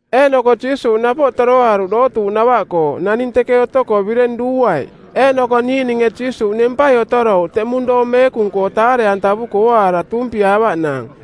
Eeꞌnoko Jiisuuꞌ napoꞌ toroaruꞌ dootuuꞌnava-koo, naning teke otoko bireng duuaiꞌ. Eeꞌnoko niiꞌninge Jiisuuꞌ nempai otorouꞌ teꞌmung doong meekung-koo taare-antavuko ooaara tuumpiaavaꞌnaang.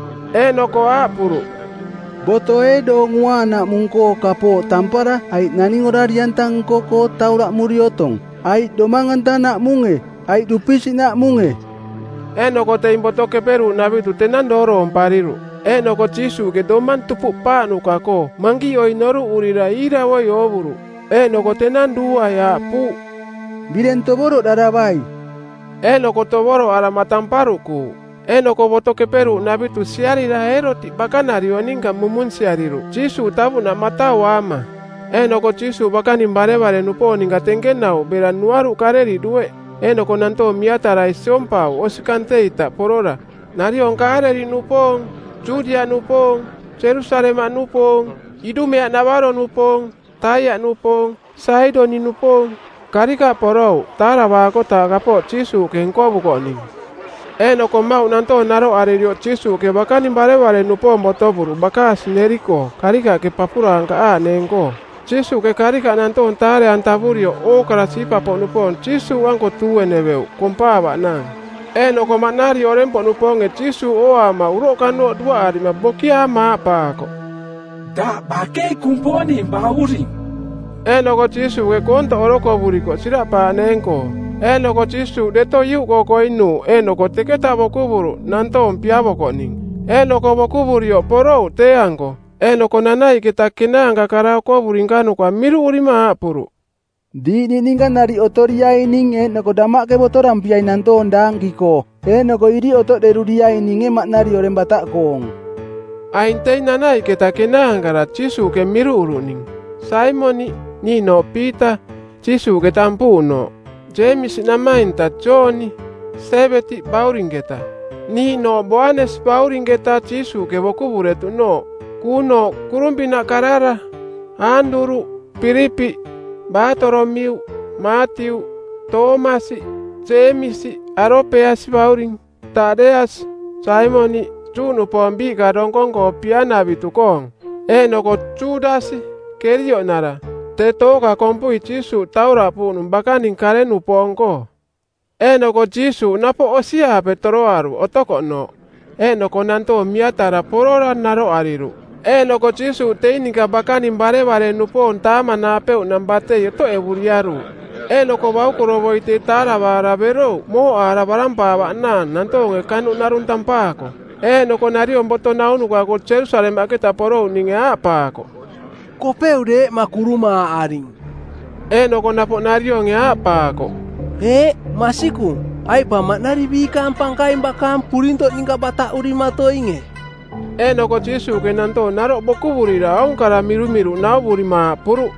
Eeꞌnoko aaꞌpuruꞌ, “Boto ee Doong Uaanaꞌmung-koo kapooꞌ tampara aiꞌ naning orari-anta nko-koo tauraꞌmuri otong? Aiꞌ domang-antanaꞌmunge, aiꞌ dupisiꞌnaꞌmunge?” Eeꞌnoko teing Boto Keperuuꞌnavitu˜ tenang dooroompariruꞌ. Eeꞌnoko Jiisuuꞌke domang tupuꞌpaaꞌnuka-koo mankiꞌoi noruꞌurira iiravoi oovuruꞌ. Eeꞌnoko tenang duuaiꞌ aaꞌpuuꞌ, “Bireng tovoroꞌdaravai.” Eeꞌnoko tovoroꞌarama tamparuꞌkuuꞌ. Eeꞌnoko Boto Keperuuꞌnavitu siarira Eerotiꞌ bakanariong ninka mumunsiariruꞌ Jiisuuꞌ tavuꞌnaꞌ matauaama. Eeꞌnoko Jiisuuꞌ bakaning barevare-nupoong ninka tenkenauꞌ bera nuaruꞌ Kaaleliꞌ dueꞌ. Eeꞌnoko nantoong miatarai siompauꞌ osi kante-ita porora, nariong Kaaleliꞌnupoong, Judiaꞌnupoong, Jerusalemaꞌnupoong, Idumeaꞌnavaro-nupoong, Taiaꞌnupoong, Saidoniꞌnupoong. Karikaꞌ porouꞌ taaravaakotaaꞌ kapooꞌ Jiisuuꞌke nkovukoꞌning. Eeꞌnoko mmauꞌ nantoong naroꞌaririoꞌ Jiisuuꞌke bakaning barevare-nupoong botovuruꞌ bakaasi neri-koo karikaꞌke papurankaꞌaaꞌneeng-koo. Jiisuuꞌke karikaꞌ nantoong taare-antavurioꞌ ookara siipa-poꞌnupoong Jiisuuꞌanko tuueneveuꞌ kompaavaꞌnaang. Eeꞌnoko maꞌnari oreng-poꞌnupoonge Jiisuuꞌ ooaama uroꞌkanooꞌ duaꞌarima bokiaama aaꞌpaakoꞌ, “Daꞌ bakei Kumponing Bauring.” Eeꞌnoko Jiisuuꞌke koontoꞌ orokovuriko siraꞌpaaꞌneeng-koo. Eeꞌnoko Jiisuuꞌ deto iuꞌkoo koinuuꞌ eeꞌnoko teketa bokuvuruꞌ nantoong piavokoꞌning. Eeꞌnoko bokuvurioꞌ porouꞌ tee-anko. Eeꞌnoko nanaiꞌketa kenaanka kara okovuri nkanuka miruꞌurima aaꞌpuruꞌ, “Diiꞌ niꞌninka nariꞌ otoriaining eeꞌnoko damaꞌke botorampiai nantoong daanki-koo. Eeꞌnoko iriꞌ otoꞌderuriaininge maꞌnari oreng bataꞌkoong.” Aing teing Nanaiꞌketa Kenaankara Jiisuuꞌke miruꞌuruꞌning: Saimoniꞌ, niiꞌnooꞌ Piita, Jiisuuꞌke tampuuꞌnooꞌ; Jeemisi namainta Jooni, Siebedi baurinketa, niiꞌnooꞌ Boanesi baurinketa Jiisuuꞌke bokuvuretuꞌnooꞌ, kuunooꞌ kurung-pinaꞌ karara; Aanduruꞌ; Pilipiꞌ; Baatolomiuꞌ; Maatiuꞌ; Toomasi; Jeemisi, Alopeasi bauring; Taꞌdeasi; Saimoniꞌ, Juꞌnupoong biiꞌka donkong-koo pia-navitu-koong; eeꞌnoko Judasi, Kerioꞌnara, tee tooka kompui Jiisuuꞌ tauraꞌpuuꞌnung bakaning kare-nupoong-koo. Eeꞌnoko Jiisuuꞌ napoꞌ osi-aape toroaruꞌ otokoꞌnooꞌ. Eeꞌnoko nantoong miatara porora naroꞌariruꞌ, eeꞌnoko Jiisuuꞌ teing ninka bakaning barevare-nupoong taamanaapeuꞌnang batei otoꞌevuriaruuꞌ. Eeꞌnoko baukorovoi tee taaravaara berouꞌ mooꞌaara barampaavaꞌnaang nantoonge kanuꞌ narung tampaako. Eeꞌnoko nariong boto naunuka-koo Jerusalemaꞌketa porouꞌninge aaꞌpaakoꞌ, “Kopeu deeꞌma kurumaaꞌaring.” Eeꞌnoko napoꞌ narionge aaꞌpaakoꞌ, “Eeꞌ, masikung, aiꞌ pa maꞌnari biikaang pankaing bakaang purintoꞌ ninka bataꞌurimatoinge.” Eeꞌnoko Jiisuuꞌke nantoong naroꞌ bokuvurira aung kara mirumiruꞌ nauvurima aaꞌpuruꞌ,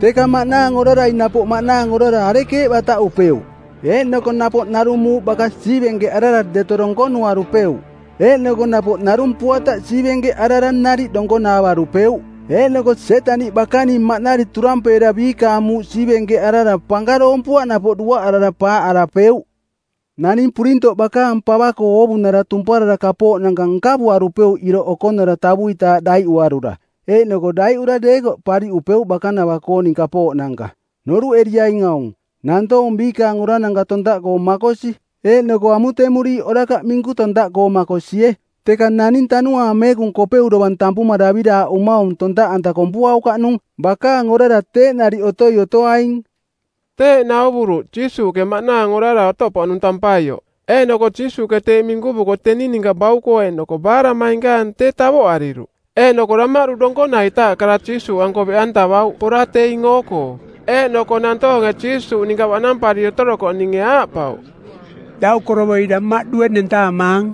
“Teka maꞌnaang orarai napoꞌ maꞌnaang orara arekeeꞌ bataꞌupeuꞌ? Eeꞌnoko napoꞌ narung muuꞌ baka siivenkeꞌarara deto donkonuarupeuꞌ. Eeꞌnoko napoꞌ narung puataꞌ siivenkeꞌarara nariꞌ donkonaavarupeuꞌ. Eeꞌnoko Sietaniꞌ bakaning maꞌnari turampeera biikaang muuꞌ siivenkeꞌarara pankaroompuaꞌ napoꞌ duaꞌarara paaꞌarapeuꞌ. Naning purintoꞌ bakaang pava-koo oovunara tumparara kapooꞌnanka nkavuarupeuꞌ iroꞌ okonara tavuitaaꞌ daiꞌuarura. Eeꞌnoko daiꞌura deekoꞌ pariꞌupeuꞌ bakanava-kooning kapooꞌnanka. “Noruꞌeriaing aung, Nantoong biikaang orarananka tontaꞌkoo makosi eeꞌnoko amutemuriiꞌ orakaꞌ minku tontaꞌkoo makosie. Teka naning Tanuaang Meekung Kopeu dovang tampuma daviraaꞌumaung tontaꞌanta kompuaukaꞌnung. Bakaang orara teeꞌ nariꞌ otoi otoaing.” Teeꞌ nauvuruꞌ Jiisuuꞌke, maꞌnaang orara otoꞌpoꞌnung tampaioꞌ. Eeꞌnoko Jiisuuꞌke teeꞌ minkuvuko teni ninka bauko eeꞌnoko baaraꞌmainkaang tee tavoꞌariruꞌ. Eeꞌnoko damaꞌdu donkonaitaaꞌ kara Jiisuuꞌanko beꞌantavauꞌ pora teing oo-koo. Eeꞌnoko nantoonge Jiisuuꞌ ninka baꞌnampariri otorokoꞌninge aaꞌpauꞌ, “Daukorovoi damaꞌdue nentaamaang.”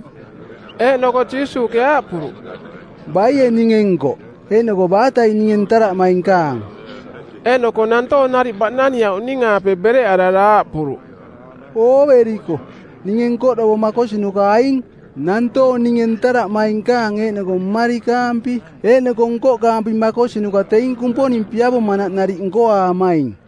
Eeꞌnoko Jiisuuꞌke aaꞌpuruꞌ, “Baie ninge nkoꞌ? Eeꞌnoko baatai ninge ntaraꞌmainkaang?” Eeꞌnoko nantoong nariꞌ baꞌnaniauꞌning-aape bereꞌarara aaꞌpuruꞌ, “Ooveriko, ninge nkoꞌdovo makosinuka aing.” Nantoong ninge ntaraꞌmainkaang eeꞌnoko mmarikaampi eeꞌnoko nkoꞌkaampi makosinuka teing Kumponing piavomanaꞌ nariꞌ nkoaamaing.